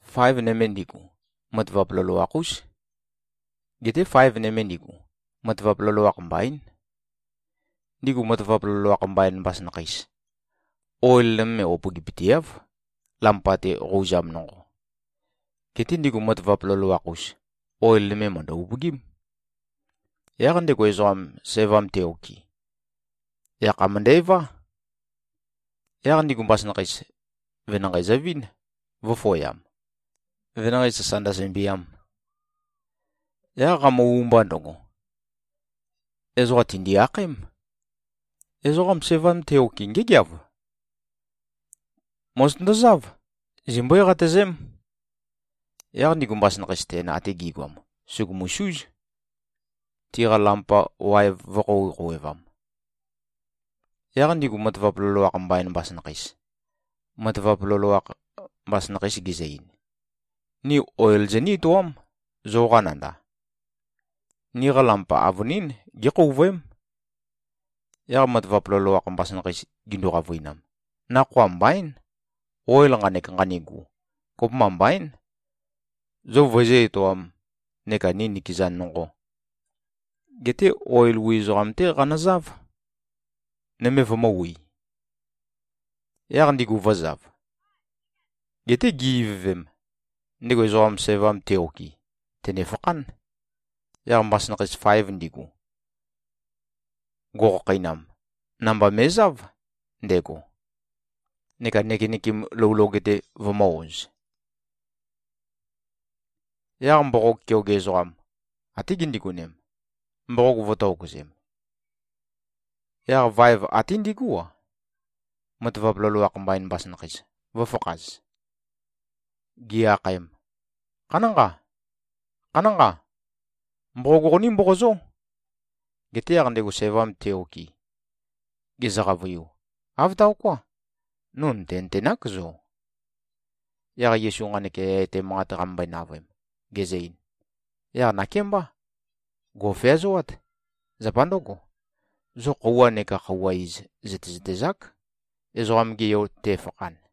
Faev nøme ndigu, matavap loloakh-ús. Geté faev nøme ndigu, matavap loloakh mbaín. Ndigu matavap loloakh mbain mbasønakheis, oil nøme upøgipøteáv, lampa-te qouzam nonqo. Geté ndigu matavap loloakh-us, oil nøme mø̀ndø-upøgím. Yaq ndego ezoqam, sævam te-okɨ, yakha mø̀ndævá. Yaq ndigu mbasønakheis, venanqei zøvín, vø̄føyam, venanqei sasa ndøsømbiam. Yaq qamø-umba ndøgo, ezoqa tìndi-akhaém, ‘Ezoqam sævam te-okɨ, ngégeav! Mòzotøndozáv. Zimbøé-qatøzém.’ Yaq ndigu mbasønakheis ten ate gi꞉goam, sùgumusúz, tiqa lampa waev vø̄-khouwe-khouwevam. Yaq ndigu matavap loloakh mbain mbasønakheis, matavap loloakh mbasønakheis gizø-ein, ‘Ni oil zoní-etoám, zoqa nanda. Niqa lampa avønín gékhouvøém.’ Yaq matavap loloakh mbasønakheis gindu-qavøinam, ‘Nakhoa mbaín. Oil nqanek nqanigu, kopømba mbaín, zo vøizǿ-etoām neka ni nikeza nonqo. Geté oil wi ezoqam-té qanøzáv, nøme vømø̄wi.’ Yaq ndigu vø̄zav. Geté gi-ivøvem, ndego ezoqam sævam te-okɨ, tènefakhán. Yaq mbasønakheis faev ndigu, go꞉khakheinam, namba me꞉záv ndego, neka nøkenøkem lou loge-te vømø̄-oz. Yaq mboqog keoge ezoqam, até gindigonem, mboqog vø̄tokøzem. Yaq vaev até ndigú-a, matavap loloakh mbain mbasønakheis, vø̄fakhaz. Gi-akhaem, ‘Khanánqa. Khanánqa. Mboqog qoní-mboqozó!’ Geté yaq ndego sævam te-okɨ, gezø-qavøiu, ‘Āv taoká. No nø̀tenøtenák zo.’” Yaq Yesu nqanek yaya etæ manqat qamømbøe-navøem, gezø-ein, “Yaq nakémbá. Gò꞉feazoát. Zapa ndǿgo, zo khøuwa neka khøuwa iz zø̀tezøtezák, Ezoqam-ge Yo te꞉fakhan.”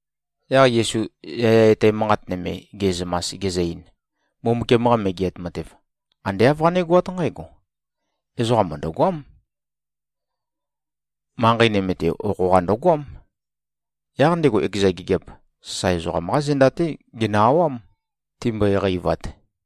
Yaq Yesu yaya etæ manqat nøme ge꞉zømas, gezø-ein, “Mbumbukiam-qa Megeat Matev, ande āv qanégoát nqǽgo: Ezoqam mø̀ndøgoám. Manqei nøme-te okho-qa ndøgoám. Yaq ndego ekeza gigiap, sasae ezoqam-qá zenda-té genø-awám, timbøe-qeivat.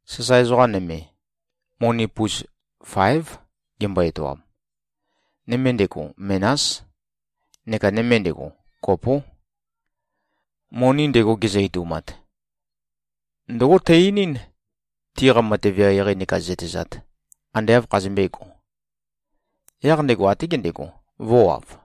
Sasae ezoqa nøme, moni pus fáev gembo-etoam. Nøme ndego, menás. Neka nøme ndego, kopó. Moni ndego gezø-etoumat, ndǿgo tø-einín, tiqa matev eqeieqei neka zøtezat, ande āv khazømbēgo. Yaq ndego até gendego, vø̄wav.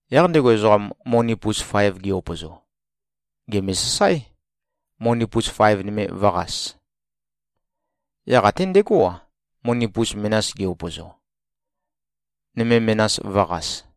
Yaq ndego ezoqam, moni pus faev ge-upøzo, gème-sasáe, moni pus faev nøme vø̄qas. Yaq até ndegó-a, moni pus menas ge-upøzo, nøme menas vø̄qas.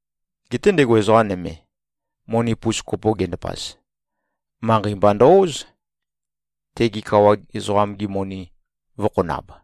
Geté ndego ezoqa nøme, moni pus kopo gendapaz, manqei mba ndø-óz, tege kawa ezoqam-gi moni vø̄khonab.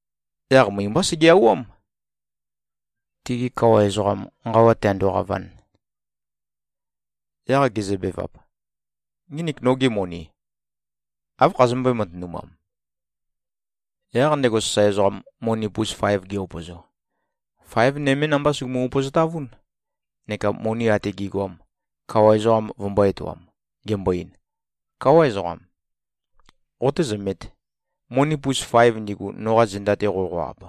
Yaq møi-mbá sege-awám, tige kawa ezoqam nqawa tēāndō-qāvān. Yaq gezøbevap, ‘Nginik nogi moni, áv khazømbøé-matønumam?’ Yaq ndego sasae ezoqam, moni pus faev ge-upøzo, faev nømé namba sùgumu-upøzotavún, neka moni ate gi꞉goam, kawa ezoqam vømbō-etoam, gembo-ein, ‘Káwa ezoqam. Qotézømēt. Moni pus faev ndigu, noqa zenda-te qoqo-ab,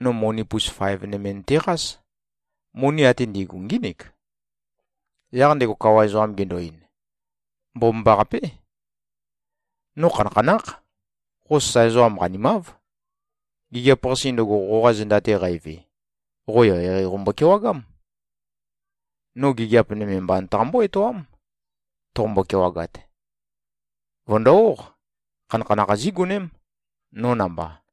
no moni pus faev nøme nøteqás. Moni ate ndi꞉gu, ngínik.’ Yaq ndego kawa ezoqam gendo-ein, ‘Mbomambaqapé. No khanakhanákh. Qo sasae ezoqam qanimáv. Gigiap-qase ndøgo, qoqa zenda-te qæve, qo eqeieqei qombo-kewagám. No gigiap nøme mba nøtaqambó-etoám, toqombo-kewagat. Vø̀ndo-óq. Khanakhanakh zígoném, no namba.’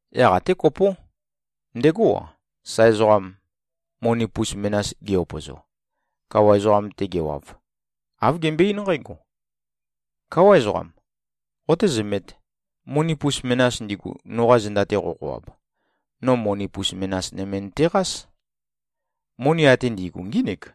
Yaq até kopó, ndegó-a, sasae ezoqam, moni pus menas ge-upøzo. Kawa ezoqam-te gewav, āv gembøe-eín nqǽgo, ‘Káwa ezoqam. Qotézømēt. Moni pus menas ndigu, noqa zenda-te qoqo-ab, no moni pus menas nøme nøteqás. Moni ate ndi꞉gu, ngínik.’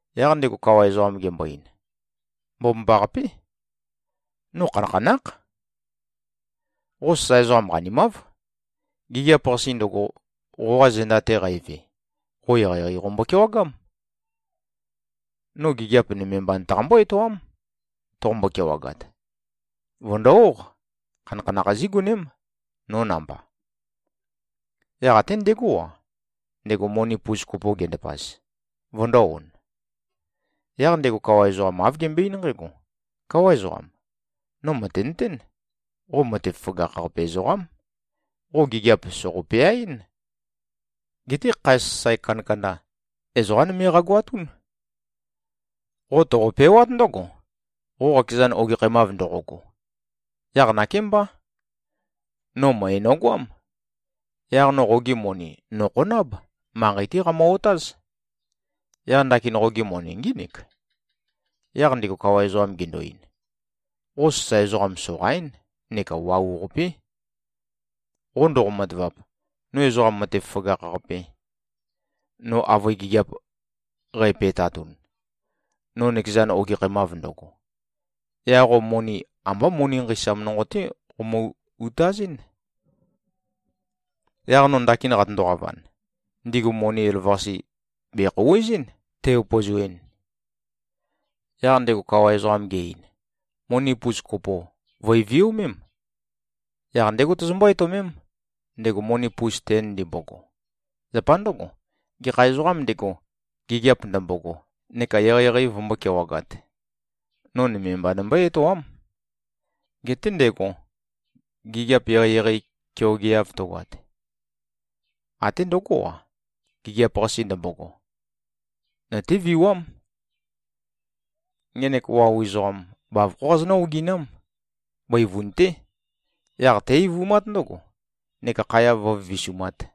Yaq ndego kawa ezoqam gembo-ein, ‘Mbomambaqapé. No khanakhanákh. Qo sasae ezoqam qanimáv. Gigiap-qase ndøgo, qoqa zenda-te qæve, qo eqeieqei qombo-kewagám. No gigiap nøme mba nøtaqambó-etoám, toqombo-kewagat. Vø̀ndo-óq. Khanakhanakh zígoném, no namba.’ Yaq até ndegó-a, ndego moni pus kopo gendapaz, vøndō-on. Yaq ndego kawa ezoqam āv gembøe-eín nqǽgo, ‘Káwa ezoqam. No mø̀tenøtén, qo matev føgakh-qape ezoqám. Qo gigiap sòqo-peaɨ́n. Geté khae sasae kandakanda, ezoqá nøme qagoatún. Qo toqopewát ndǿgo, qo qakezan ogekhæmav ndoqogo. Yaq nakémbá. No møe nogoám. Yaq no qogi moni nòkhonáb. Manqei-té qæmø-otáz. Yaq ndakin qogi moni ngínik.’ Yaq ndego kawa ezoqam gendo-ein, ‘Qo sasae ezoqam soqaín neka wau-qapé. Qo ndoqo-matavap, no ezoqa matev føgakh-qape, no avøe gigiap qæpe꞉tatun, no nøkeza ogekhæmav ndøgo, yaq qo moni, ambá moni nqeisam nonqo-té qomø-utazɨ́n. Yaq no ndakin qatøndo-qavan, ndigu moni elavøqase, bèkhouwezɨ́n, tæ-upøzoɨn.’ Yaq ndego kawa ezoqam ge-ein, ‘Moni pus kopo, vø̀e-viomém. Yaq ndégo tozombó-etøomém, ndego moni pus ten ndimbogo. Zapa ndǿgo, gekha ezoqām ndego, gigiap ndømbogo neka eqeieqei vømbó-kewagāt, no nøme mba nømbøé-etoám. Geté ndego, gigiap eqeieqei keogeav tøgoat, até ndøgó-a, gigiap-qase ndømbogo, nøtéviwám. Ngenek wau ezoqam, bavokhó qazonǿ-oginám. Bøivun-té. Yaq té-eivumát ndǿgo, neka khaya vǿvivisumāt.’”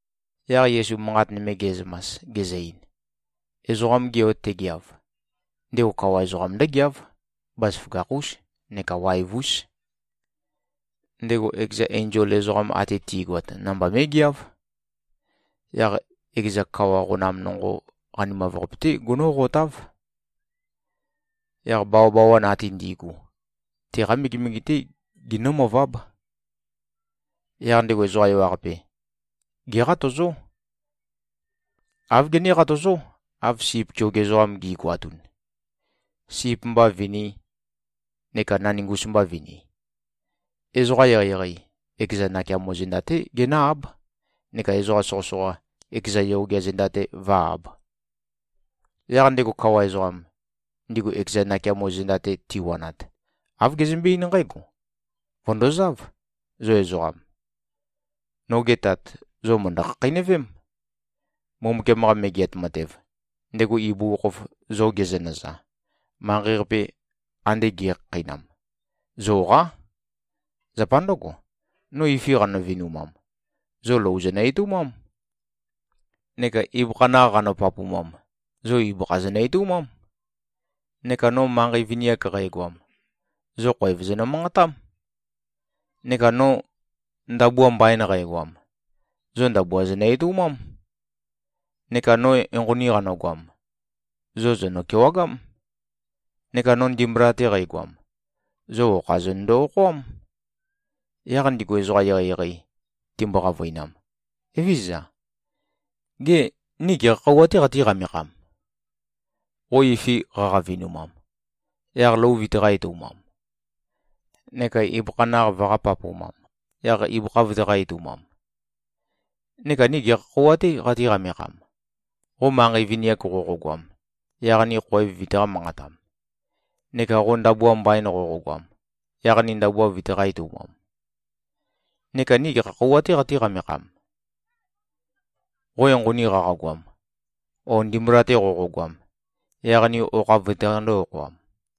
Yaq Yesu manqat nøme ge꞉zømas, gezø-ein, “Ezoqam-ge Yo tegeav, ndego kawa ezoqam ndǿgeáv. Bazaføgakh-ús neka waev-ús. Ndego ekeza enzol ezoqam ate ti꞉goat namba mé꞉geáv. Yaq ekeza kawa qonam nonqo qanimav-qape-té gonóqotáv. Yaq bawabawan ate ndi꞉gu, teqá megemege-té ginǿmøváb. Yaq ndego ezoqa ewaqape, géqatøzó. Āv gené-qatøzó, av sip keoge ezoqam gi꞉goatun, sip mba vinī, neka naningus mba vini. Ezoqa eqeieqei, ekeza nakeamo zenda-té genǿ-áb, neka ezoqa soqøsoqa, ekeza yogea zenda-te vǿ-āb. Yaq ndego kawa ezoqam, ndigu ekeza nakeamo zenda-te tiwanat, āv gezømbé-eín nqǽgo, ‘Vø̀ndozáv, zo ezoqam. Noge Tat, zo mø̀ndø-khakheinøvém. Mbumbukiam-qa Megeat Matev, ndego ibugukhokhof zo gezønøza, manqei-qape ande ge꞉khakheinam, zoqá. Zapa ndǿgo, no ifi qanø-vinumam, zo lou zonø-etøumám. Neka ibøkha naq qanø-papumam, zo ibøkha zonø-etøumám. Neka no manqei vini-ak qægoam, zo khoev zonø-manqatám. Neka no ndabua mbain qægoam, zo ndabua zonø-etøumám. Neka no enqoni qanøgoam, zo zònø-kewagám. Neka no ndimbula-te qægoam, zo okha zonøndo-okhoám.’ Yaq ndigu ezoqa eqeieqei timbo-qavøinam, ‘Evézøza. Gê, ni gekha khøuwa-tē qatí-qamekham, qo ifi qaqa-vinumam, yaq lou vøitaqā-etøumam, neka ibøkha naq vøqā-papumam, yaq ibøkha vøitaqā-etøumam? Neka ni gekha khøuwa-tē qatí-qamekham, qo manqei vini-ak qoqogoam, yaq ni khoev vøitaqā-manqatam, neka qo ndabua mbain qoqogoam, yaq ni ndabua vøitaqā-etøumam? Neka ni gekha khøuwa-tē qatí-qamekham, qo enqoni qaqagoam, o ndimbula-te qoqogoam, yaq ni okha vøitaqandō-okhoam?’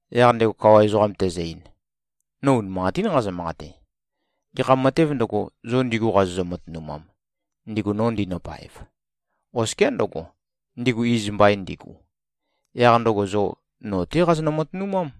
Yaq ndego kawa ezoqam tezø-ein, ‘No unimanqatín nqazø-manqate. Gekha matēv ndøgo, zo ndigu qazozø-matønumam, ndigu no ndinøpaev, oskiá ndǿgo, ndigu iz mbain ndigu, yaq ndøgo zo no-té qazonø-matønumám.’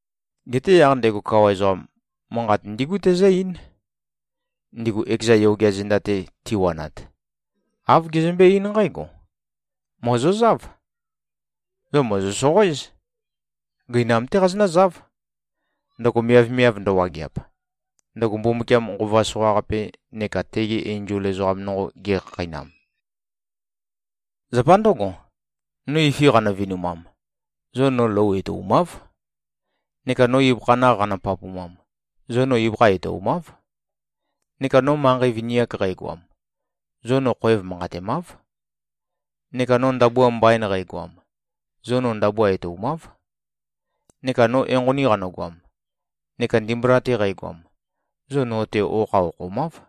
Geté yaq ndego kawa ezoqam, manqat ndígu tezǿ-eín, ndigu ekeza yogea zenda-te tiwanat. Āv gezømbé-eín nqǽgo, ‘Mòzozáv. Zo mòzo-soqoéz. Gøinam-té qazonǿzáv, ndøgo miavmiav ndøwageap, ndøgo Mbumbukiam nqova soqaqape neka tegi enzol ezoqam nonqo gekhakheinam. Zapa ndǿgo, no ifi qanø-vinumam, zo no lou etoumáv. Neka no ibøkha naq qanø-papumam, zo no ibøkha etoumáv. Neka no manqei vini-ak qægoam, zo no khoev manqatemáv. Neka no ndabua mbain qægoam, zo no ndabua etoumáv. Neka no enqoni qanøgoam neka ndimbula-te qægoam, zo no-te okha okhomáv.’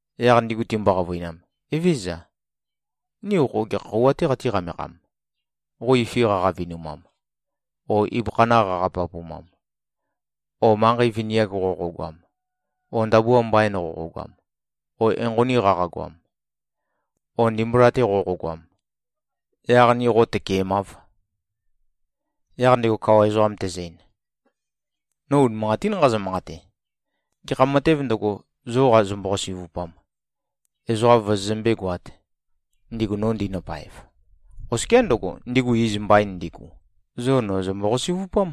Yaq ndigu timbo-qavøinam, ‘Evézøza. Ni qo gekha khøuwa-tē qatí-qamekham, qo ifi qaqa-vinumam, o ibøkha naq qaqa-papumam, o qo manqei vini-ak qoqogoam, o ndabua mbain qoqogoam, o enqoni qaqagoam, o ndimbula-te qoqogoam, yaq ni qo tøkemâv?’ Yaq ndego kawa ezoqam tezø-ein, ‘No unimanqatín nqazø-manqate. Gekha matēv ndøgo, zo qazømbo-qasi꞉vupam, ezoqa vozozømbé-goāt, ndigu no ndinøpaev, oskiá ndǿgo, ndigu iz mbain ndigu, zo no zømbo-qasi꞉vupám.’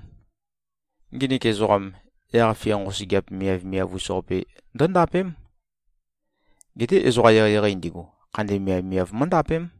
Nginik ezoqam, yaq-fia nqosøgeap miavmiav-us-qape ndǿndapém. Geté ezoqa eqeieqei ndigu, khandi miavmiav mǿndapém.”